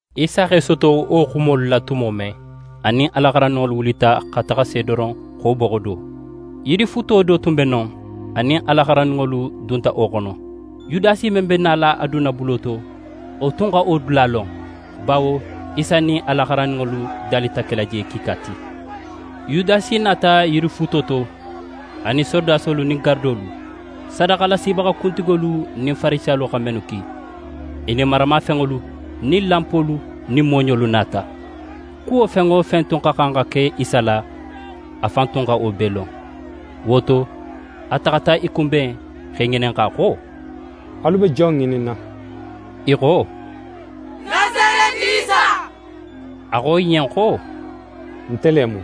Isa x'é soto wo xumolu la tumo men, a nin a la xarandinŋolu wulita xa taxa Sedoron xo boxo do. Yirifuuto do tun be non, a nin a la xarandinŋolu dunta wo xono. Yudasi men be nala a dunna bulo to, wo tun xa wo dula lon, bawo Isa nin a la xarandinŋolu dalita kela je kiika ti. Yudasi nata yirifuuto to, a nin sorodasolu nin garadolu, sadaxalasibaxa kuntigolu nin Farisiyalu xa mennu ki. I nin maramafenŋolu nin lanpolu nin mooɲolu nata. Kuwo fen wo fen tun xa xan xa ke Isa la, a fan tun xa wo bee lon. Wo to, a taxata i kunben, x'e ŋininxa xo: «Alu be jon ŋininna?» I xo: «Nasareti Isa.» A xo i ɲen xo: «Nte le mu!»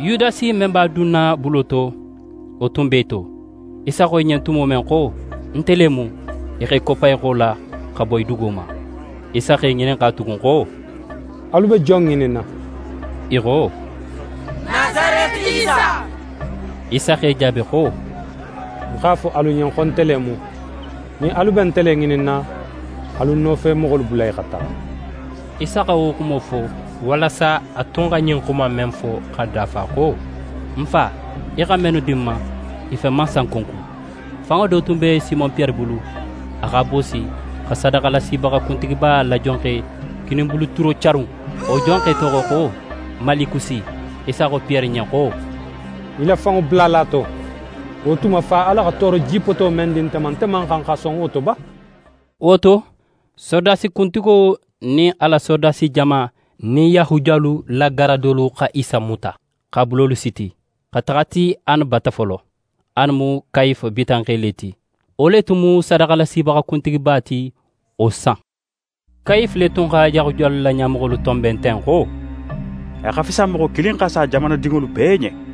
Yudasi men b'a dunna bulo to, wo tun b'e to. Isa xo i ɲen tumo men xo: «Nte le mu», i x'e koppa i xo la, xa boyi dugo ma. Isa x'e ŋininxa tugun xo: «Alu be jon ŋininna?» I xo: «Nasareti Isa.» Isa x'e jaabi xo: «Ń x'a fo alu ɲen xo nte le mu. Nin alu be nte le ŋininna, alu ń nofemoxolu bula i xa taxa.» Isa xa wo xumo fo, walasa a tun xa ɲin xuma in men fo xa dafa xo: «Ń Fa, í xa mennu di ń ma, i fen man sanko ń kun.» Fanŋo tun be Simon Piyere bulu, a x'a boosi, xa sadaxalasibaxa kuntigiba la jonxe kininbulu tulo carun. Wo jonxe toxo xo Malikusi. Isa xo Piyere ɲen xo: «Í la fanŋo bula a la to. Wo tuma, Fa Ala xa tooro jipoto men di nte ma, nte man xan xa son wo to ba?» Wo to, sorodasi kuntigo nin a la sorodasi jama nin Yahudiyalu la garadolu xa Isa muta, x'a bulolu siti, xa taxa a ti Ane bata folo. Ane mu Kayife bitanxe le ti, wo le tun mu sadaxalasibaxa kuntigiba ti wo san. Kayife le tun xa Yahudiyalu la ɲamoxolu tonben ten xo: «A xa fisa moxo kilin xa sa jamanadinŋolu bee ɲen.»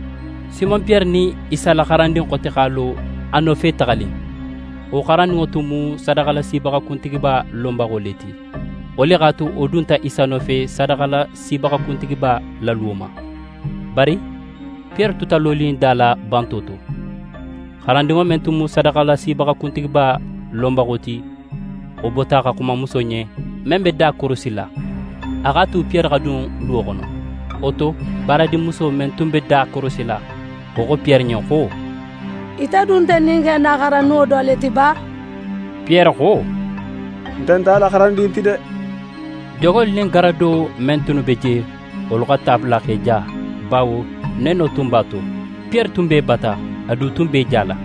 Simon Piyere nin Isa la xarandin xote x'a lo a nofe taxanin. Wo xarandinŋo tun mu sadaxalasibaxa kuntigiba lonbaxo le ti. Wo le x'a tu wo dunta Isa nofe sadaxalasibaxa kuntigiba la luwo ma. Bari Piyere tuta lonin da la, banto to. Xarandinŋo men tun mu sadaxalasibaxa kuntigiba lonbaxo ti, wo bota xa xuma muso ɲen, men be da korosila. A x'a tu Piyere xa dun luwo xono. Wo to, baaradinmuso men tun be da korosila, wo xo Piyere ɲen xo: «Ite du nte ɲin xe in na xarandinŋo do le ti ba?» Piyere xo: «Nte nt'a la xarandin ti de!» Jonŋolu nin garado men tunnu be je, wolu xa ta bula x'e ja, bawo neno tun b'a to. Piyere tun b'e bata. A du tun b'é jala.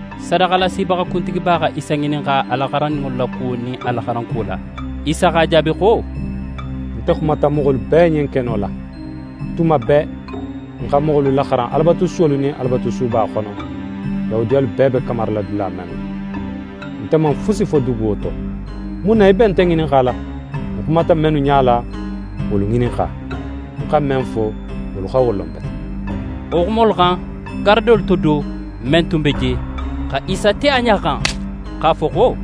Sadaxalasibaxa kuntigiba xa Isa ŋininxa a la xarandinŋolu la kuwo nin a la xaranŋo kuwo la. Isa x'a jaabi xo: «Nte xumata moxolu bee ɲen keno la. Tuma bee ń xa moxolu laxaran Alabatusuwolu nin Alabatusuba xono, Yahudiyalu bee be kamarila dula mennu. Nte man fusi fo duguwo to. Mun na í be nte ŋininxala? Ń xumata mennu ɲala, wolu ŋininxa. Ń xa men fo, wolu xa wo lon bete.» Wo xumolu xan, garadolu to do, men tun be je, xa Isa te a ɲa xan, x'a fo xo: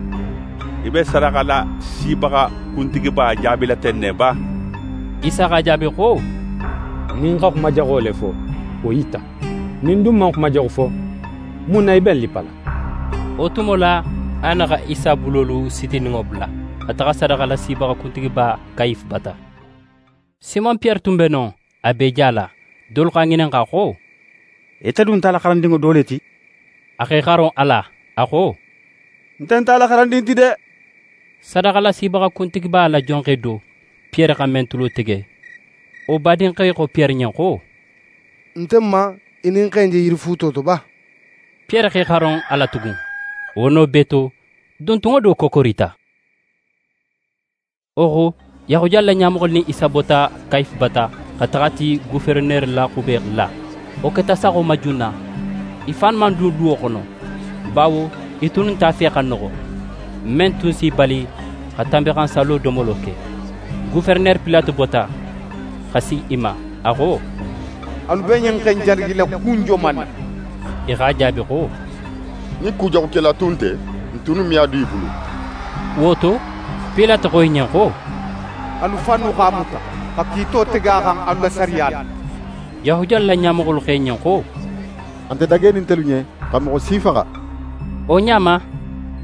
«Í be sadaxalasibaxa kuntigiba jaabila ten ne ba?» Isa x'a jaabi xo: «Nin ń xa xuma jaxo le fo, wo yita. Nin ń dun man xuma jaxu fo, mun na í be ń lippala?» Wo tumo la, Ane xa Isa bulolu sitininŋo bula, xa taxa sadaxalasibaxa kuntigiba Kayife bata. Simon Piyere tun be non, a b'é jala. Dolu x'a ŋininxa xo: «Ite du nt'a la xarandinŋo do le ti?» A x'é xaro a la, a xo: «Nte nt'a la xarandin ti de!» Sadaxalasibaxa kuntigiba la jonxe do, Piyere xa men tulo tege, wo badinxe xo Piyere ɲen xo: «Nte man í nin xe in je yirifuuto to ba?» Piyere x'é xaro a la tugun. Wo no bee to, duntunŋo do kokorita. Wo xo, Yahudiyalu la ɲamoxolu nin Isa bota Kayife bata, xa taxa a ti goferenere la xube la. Wo keta saxo ma junna. I fannu man dun luwo xono, bawo i tunnu nt'a fe xa noxo, men tun s'i bali xa Tanbinxansallo domolo ke. Goferenere Pilate bota, xa si i ma. A xo: «Alu be ɲin xe in jalagila kun joman na?» I x'a jaabi xo: «Nin kujaxukela tun nte, n tunnu me a dun í bulu.» Wo to, Pilate xo i ɲen xo: «Alu fannu x'a muta, xa kiito tege a xan, alu la sariya la.» Yahudiyalu la ɲamoxolu xo a ɲen xo: «A nte dagenin ntelu ɲen xa moxo si faxa.» Wo ɲa ma,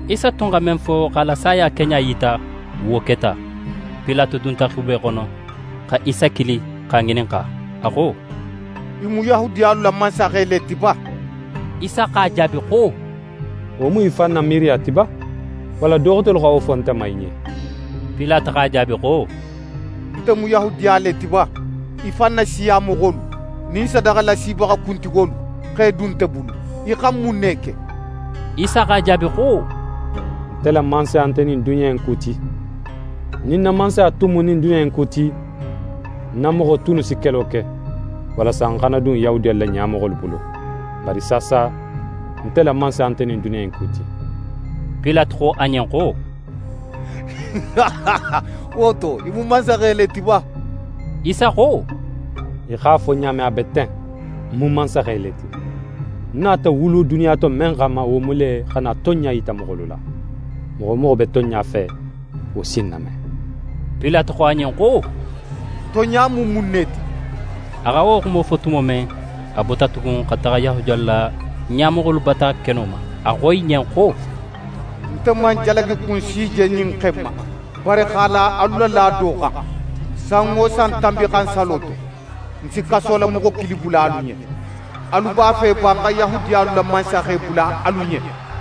Isa tun xa men fo x'a la saya keɲa yita, wo keta. Pilate dunta xube xono, xa Isa kili x'a ŋininxa. A xo: «Í mu Yahudiyalu la mansaxe le ti ba?» Isa x'a jaabi xo: «Wo mu í fan na miiriya ti ba, walla do xotelu xa wo fo nte ma í ɲen?» Pilate x'a jaabi xo: «Nte mu Yahudiya le ti ba? Í fan na siya moxolu nin sadaxalasibaxa kuntigolu x'é dun nte bulu. Í xa mun ne ke?» Isa x'a jaabi xo: «Nte la mansaya nte ɲin duniya in ku ti. Nin ń na mansaya tun mu ɲin duniya in ku ti, ń na moxo tunnu si kelo ke, walasa ń xana dun Yahudiyalu la ɲamoxolu bulu. Bari saasa, nte la mansaya nte ɲin duniya in ku ti.» Pilate xo a ɲen xo: «Wo to, í mu mansaxe le ti ba?» Isa xo: «Í x'a fo ɲa men, a be ten. Ń mu mansaxe le ti. Ń nata wulu duniya to men xanma, wo mu le, xa na tonɲa yita moxolu la. Moxo wo moxo be tonɲa fe, wo si ń name.» Pilate xo a ɲen xo: «Tonɲa mu mun ne ti?» A xa wo xumo fo tumo men, a bota tugun xa taxa Yahudiyalu la ɲamoxolu bata keno ma. A xo i ɲen xo: «Nte man jalagikun si je ɲin xe in ma. Bari x'a la alu la laado xan, san wo san Tanbinxansallo to, ń si kasolamoxo kilin bula alu ɲen. Alu b'a fe ba, ń xa Yahudiyalu la mansaxe bula alu ɲen?»